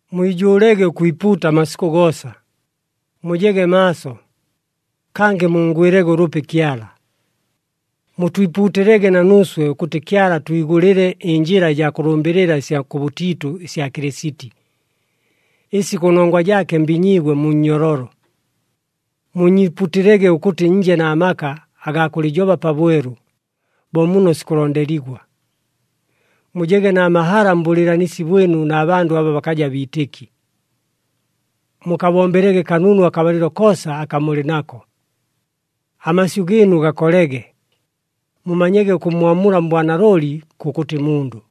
Mwijʉʉlege ʉkwipuuta amasikʉ goosa, mujege maaso, kangɨ munngwɨlege ʉlʉpi Kyala. Mutwipuutɨlege na nuuswe ʉkʉtɨ Kyala atwigʉlɨle ɨnjɨla ɨjaa kʉlʉmbɨlɨla ɨsya kʉbʉtiitʉ ɨsya Kɨlɨsiti, ɨsi kʉnongwa jaake mbinyiigwe mu nnyololo. Muunyiipuutɨlege ʉkʉtɨ nje na maka agaa kʉlɨjoba pabwelu bo muno sikʉlondeligwa. Mujege na mahala mbʉlɨɨlanisi bwɨnu na bandʉ aba bakaja biitɨki. Mukabombelege kanunu akabalɨlo koosa aka mulɨ nako. Amasyʉ gɨɨnu gakolege, mumanyege ʉkʉmmwamula mbwanalooli kʉkʉtɨ mundʉ.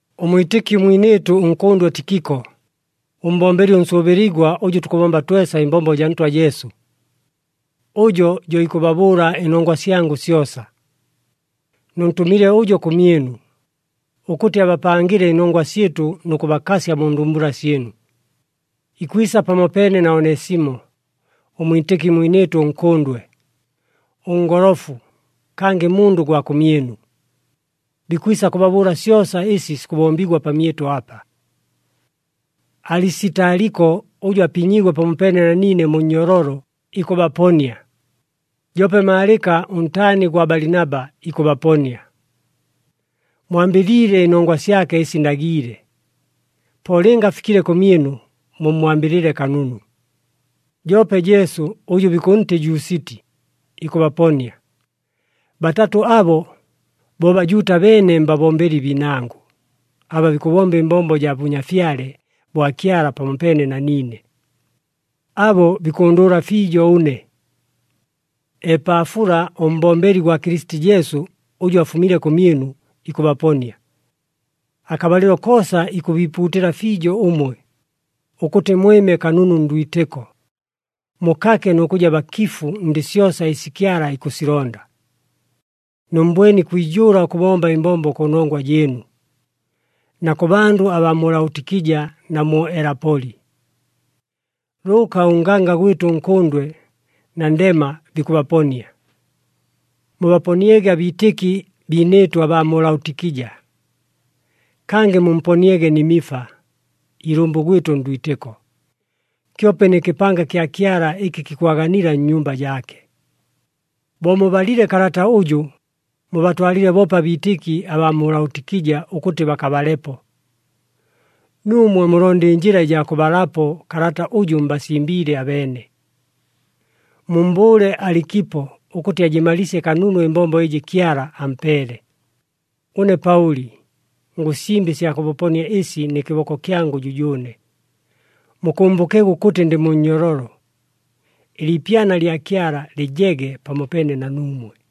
Ʉmwitɨki mwinɨɨtʉ ʉnkʉndwe Tikiko, ʉmbombeli ʉnsʉʉbɨligwa ʉjʉ tukʉbomba twesa ɨmbombo jaa Ntwa Jesu, ʉjo jo ikʉbabʉʉla ɨnongwa syangʉ syosa. Nʉntʉmile ʉjo kʉmyɨnu, ʉkʉtɨ abapangɨle ɨnongwa syɨtʉ nʉ kʉbakasya mu ndumbula syɨnu. Ikwisa pamopeene na Onesimo, ʉmwitɨki mwinɨɨtʉ ʉnkʉndwe, ʉngolofu, kangɨ mundʉ gwa kʉmyɨnu. Bikwisa kʉbabʉʉla syosa ɨsi sikʉbombigwa pamyɨtʉ apa. Alisitaliko ʉjʉ apinyiigwe pamopeene na niine mu nnyololo, ikʉbaponia. Joope Maalɨka, ʉntaani gwa Balinaba, ikʉbaponia. Mwambɨliile ɨnongwa syake ɨsi ndagiile, po lɨnga afikile kʉmyɨnu, mummwambɨlɨle kanunu. Joope Jesu ʉjʉ bikʉntɨ Jusiti, ikʉbaponia. Batatʉ abo, bo Bajuuta beene mbabombeli biinangʉ, aba bikʉbomba ɨmbombo jaa Bʉnyafyale bwa Kyala pamopeene na niine. Abo bikʉndʉʉla fiijo ʉne. Epaafula, ʉmbombeli gwa Kɨlɨsiti Jesu ʉjʉ afumile kʉmyɨnu, ikʉbaponia. Akabalɨlo koosa ikʉbiipuutɨla fiijo ʉmwe, ʉkʉtɨ mwɨme kanunu ndwitɨko, mukake nʉ kʉja bakifu ndɨ syosa ɨsi Kyala ikʉsilonda. Nʉmmbwene ikwijʉʉla ʉkʉbomba ɨmbombo kʉnongwa jɨɨnu, na kʉ bandʉ abaa mu Laotikija, na mu Elapoli. Lʉʉka ʉnganga gwɨtʉ ʉnkʉndwe, na Ndema bikʉbaponia. Mubaponiege abiitɨki biinɨɨtʉ abaa mu Laotikija. Kangɨ mumponiege Nimifa, ilʉmbʉ gwɨtʉ ndwitɨko, kyope nɨ kɨpanga kya Kyala ɨkɨ kikwaganila nnyumba jaake. Bo mubalile kalata ʉjʉ, mubatwalɨle boope abiitɨki abaa mu Laotikija ʉkʉtɨ bakabalepo. Nuumwe mulonde ɨnjɨla ɨjaa kʉbalapo kalata ʉjʉ mbasimbiile abeene. Mummbʉʉle Alikipo ʉkʉtɨ ajɨmalɨɨsye kanunu ɨmbombo ɨjɨ Kyala ampeele. Ʉne Paʉli ngʉsimba ɨsya kʉbaponia ɨsi nɨ kɨboko kyangʉ jʉjʉʉne. Mukʉmbʉkege ʉkʉtɨ ndɨ mu nnyololo. Ɨliipyana lya Kyala lɨjege pamopeene na nuumwe.